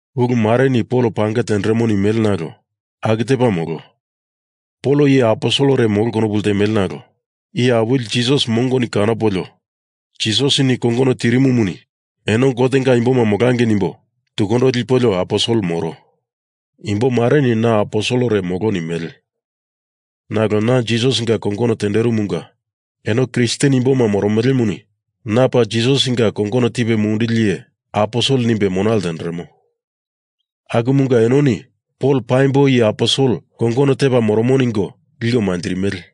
Ulumareni Pol pange tenderemo nimele nalo aku tepa molo. Pol iye aposelere molo konopu ltemele nalo Iye Awili Jisas mongoni kanopolio Jisasini kongono tirimumuni eno Gotenga imboma molangei nimbo tukundo lipolio aposel moro. Imbomareni na aposelere molo nimele. Nalo na Jisasinga kongono tenderimunga eno Kristen imboma moromelemuni na paa Jisasinga kongono tipe munduli iye aposel nimbe mona ltenderemo. Akumunga enoni Pol paimbo iye aposel kongono tepa moromo ningo liko manjirimele.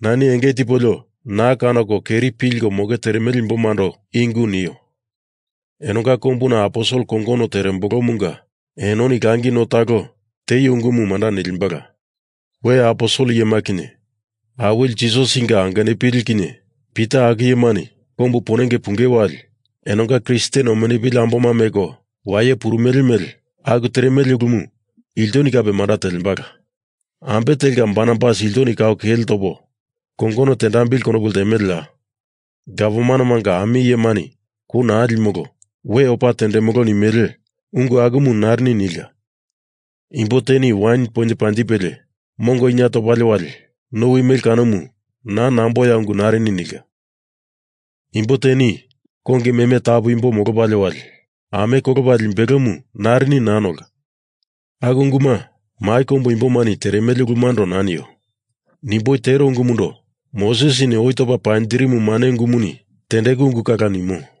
Nani enge tipolio na kanoko keri pilko moke teremele imbomando i ungu nio. Enonga kombuna aposel kongono terembolomunga enoni langi no talo tieio ungumu manda nilimbala. We aposel iyema kinye Awili Jisasinga angenupili kinye Pita aku iyemani kombu ponenge pungei wali enonga Kristen omenupili amboma meko waye purumele mele aku teremele ulumu ilto kape manda telembala. Ambe telka Barnabas iltoni kau kele topo kongono tendambili konopu ltemeleya? Gavmanemanga ami iyemani kou naa limolo, we opa tendemolo nimele ungu akumu narini nilka. Imbo teni wain poinye panjipelie mongo ina topalie wali nowi mele kanomu naa namboya ungu narini nilka. Imbo teni kongi meme tapu imbo molopalie wali ame kolopa limbelomu narini naa nolka. Aku unguma mai kombu imbomani teremele ulumundo naa nio. Nimboi tero ungumundo Mosesini oi topa panjirimu mane ungumuni tendeku ungu kala nimo.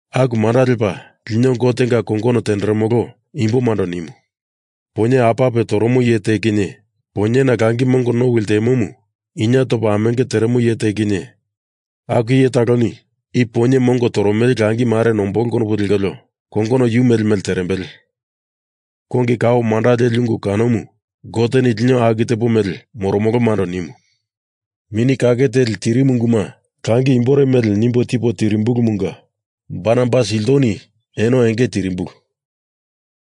Aku manda lepa lino Gotenga kongono tenderemolo imbomando nimu. Poinye apape toromo iye te kinye poinyena langi mongo nowi ltemomu ina topa amenge teremo iye te kinye aku iye taloni i poinye mongo toromele langimare nombolo konopu lekolio kongono yu mele mele terembele. Kongi kao manda leli ungu kanomu Goteni lino aku tepo mele moromolomando nimu. Mini Kake Teli tirimu unguma langi imbore mele nimbo tipo tili tirimbulumunga Barnabas iltoni eno enge tirimbulu.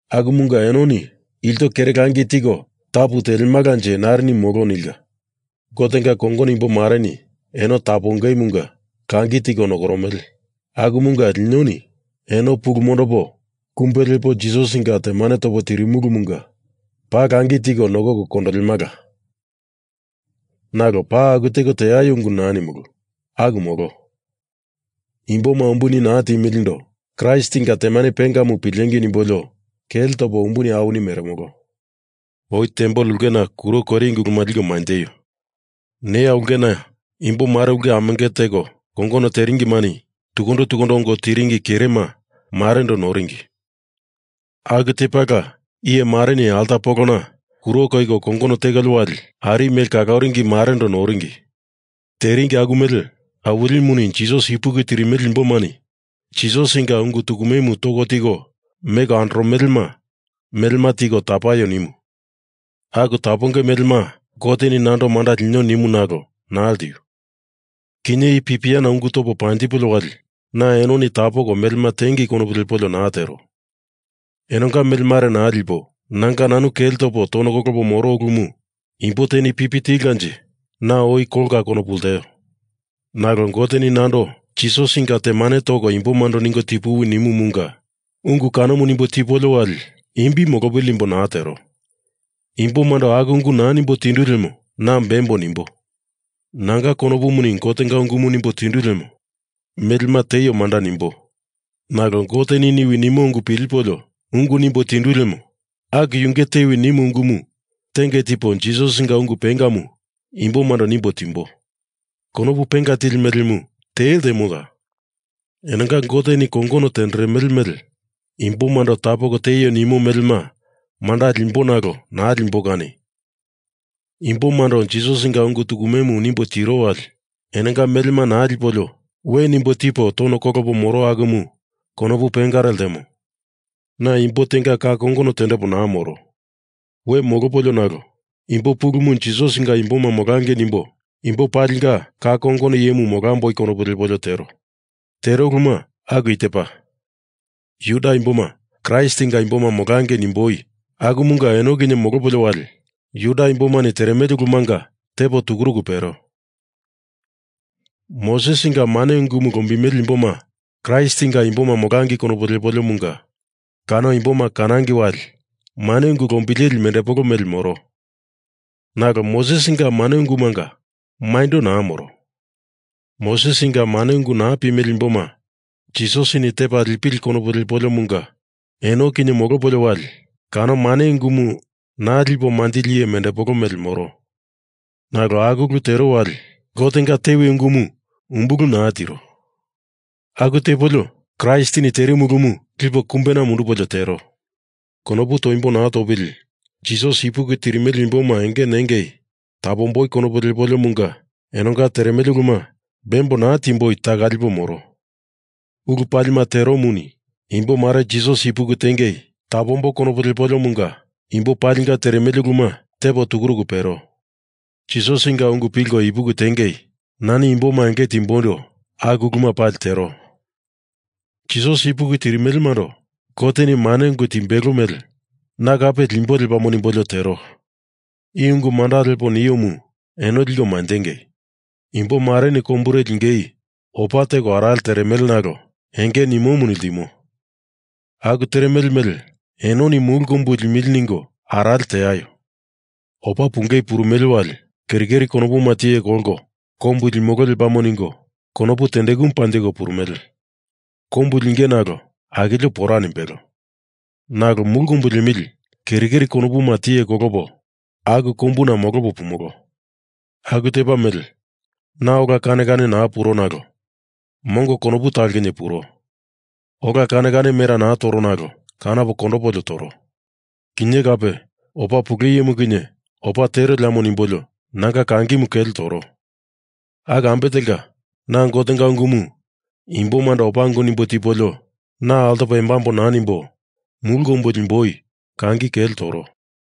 Akumunga enoni ilto kere langi tiko tapu telemalanje narini molo nilka. Gotenga kongono imbomareni eno tapongemunga langi tiko nokoromele. Akumunga linoni eno pulu mondopo kumbe lepo Jisasinga temane topo tirimulumunga paa langi tiko nokoko kondolemala. Nalo paa aku teko teaio ungu naa nimulu. Aku molo. Imboma umbuni naa timilindo Kraistinga temane pengamu pilengei nimbolio kele topo umbuni awini meremolo. Oi tempel ulkena kuro koiringi uluma liko manjeio. Neya ulkena imbomare ulke amenge teko kongono teringimani tukundo tukundo ongo tiringi kerema marendo noringi. Aku tepala iyemareni alta polona kuro koiko kongono tekolio wali ari mele kaloringi marendo noringi. Teringi aku mele, Awilimuni Jisas ipuki tirimele imbomani Jisasinga ungu tukumemu toko tiko meko andoromelema melema tiko nokoko tapaio nimu. Aku tapongei melema Goteni nando manda linio nimu nalo naa ltiu. Kinye i pipiana ungu topo panjipolio wali na enoni tapoko melema tingei konopu lepolio naa tero. Enonga mele mare naa lipo nanga nanu kele topo tono kolopo moro ulumu imbo teni pipi tilkanje na oi kolka konopu lteo. Nalo Goteni nando Jisasinga temane toko imbomando ningo tipuwi nimumunga, ungu kanomu nimbo tipolio wali imbi molopili nimbo naa tero. Imbomando aku ungu naa nimbo tindu lemo na bembo nimbo. Nanga konopumuni Gotenga ungumu nimbo tindu lemo melema tieio manda nimbo. Nalo Goteni niwi nimo ungu pilipolio ungu nimbo tindu lemo aku yunge tewi nimu ungumu tenge tipo Jisasinga ungu pengamu imbomando nimbo timbo. Konopu penga tili melemu te ltemoya? Enonga Goteni kongono tenderemele imbomando tapoko tieio nimo melema manda limbo nalo naa limboi kani imbomando Jisasinga ungu tukumemu nimbo tiro wali enonga melema naa lipolio we nimbo tipo tono kolopo moro akumu konopu pengare ltemo. Na imbo tenga ka kongono tendepo naa moro. We molopolio nalo imbo pulumu Jisasinga imboma molangei nimboi imbo palinga ka kongono iyemu molamboi konopu lepolio tero. Tero uluma aku i tepa. Juda imboma Kraistinga imboma molangei nimboi akumunga eno kinye molopolio wali Juda imbomani teremele ulumanga tepo tukuruku pero. Mosesinga mane ungumu lombimele imboma Kraistinga imboma molangei konopu lepoliomunga kano imboma kanangei wali mane ungu lombileli mendepolo mele moro. Nalo Mosesinga mane ungumunga maindo naa moro. Mosesinga mane ungu naa pimele imboma Jisasini tepa lipili konopu lepoliomunga eno kinye molopolio wali kano mane ungumu naa lipo manjili iye mendepolo mele moro. Nalo aku ulu tero wali Gotenga tewi ungumu umbulu naa tiro. Aku tepolio Kraistini terimu ulumu lipo kumbena mundupolio tero. Konopu toimbo naa topili Jisas ipuki tirimele imboma enge nengei tapomboi konopu lepoliomunga enonga teremele uluma bembo naa timboi taka lipo moro. Ulu palima teromuni imbomare Jisas ipuki tiengei tapomboi konopu lepoliomunga imbo palinga teremele uluma tepo tukuruku pero. Jisasinga ungu pilko ipuki tiengei nani imboma enge timboindo aku uluma pali tero. Jisas ipuki tirimelemando Goteni mane ungu timbelo mele na kape limbo lepamo nimbolio tero. I ungu manda lepo niomu eno liko manjengei. Imbomareni kombure lingei opa teko arale teremele nalo enge nimomuni ltimo. Aku teremele mele enoni mulu kombu limili ningo arale teaio. Opa pungei purumele wali keri keri konopuma tiye kolko kombumu limolo lepamo ningo konopu tendekumu panjiko purumele. Kombu linge nalo akilio pora nimbelo. Nalo mulu kombu liemili keri keri konopuma tiye kolopo aku kombuna molopo pumolo. Aku tepa mele na ola kane kane naa puro nalo mongo konopu talo kinye puro. Ola kane kane mera naa toro nalo kanopo kondopolio toro. Kinye kape opa pule iyemu kinye opa tero lepamo nimbolio nanga kangimu kele toro. Aku ambe telka, na Gotenga ungumu imbomando opa ungu nimbo tipolio na altopo embambo naa nimbo mulu kombu limboi kangi kele toro.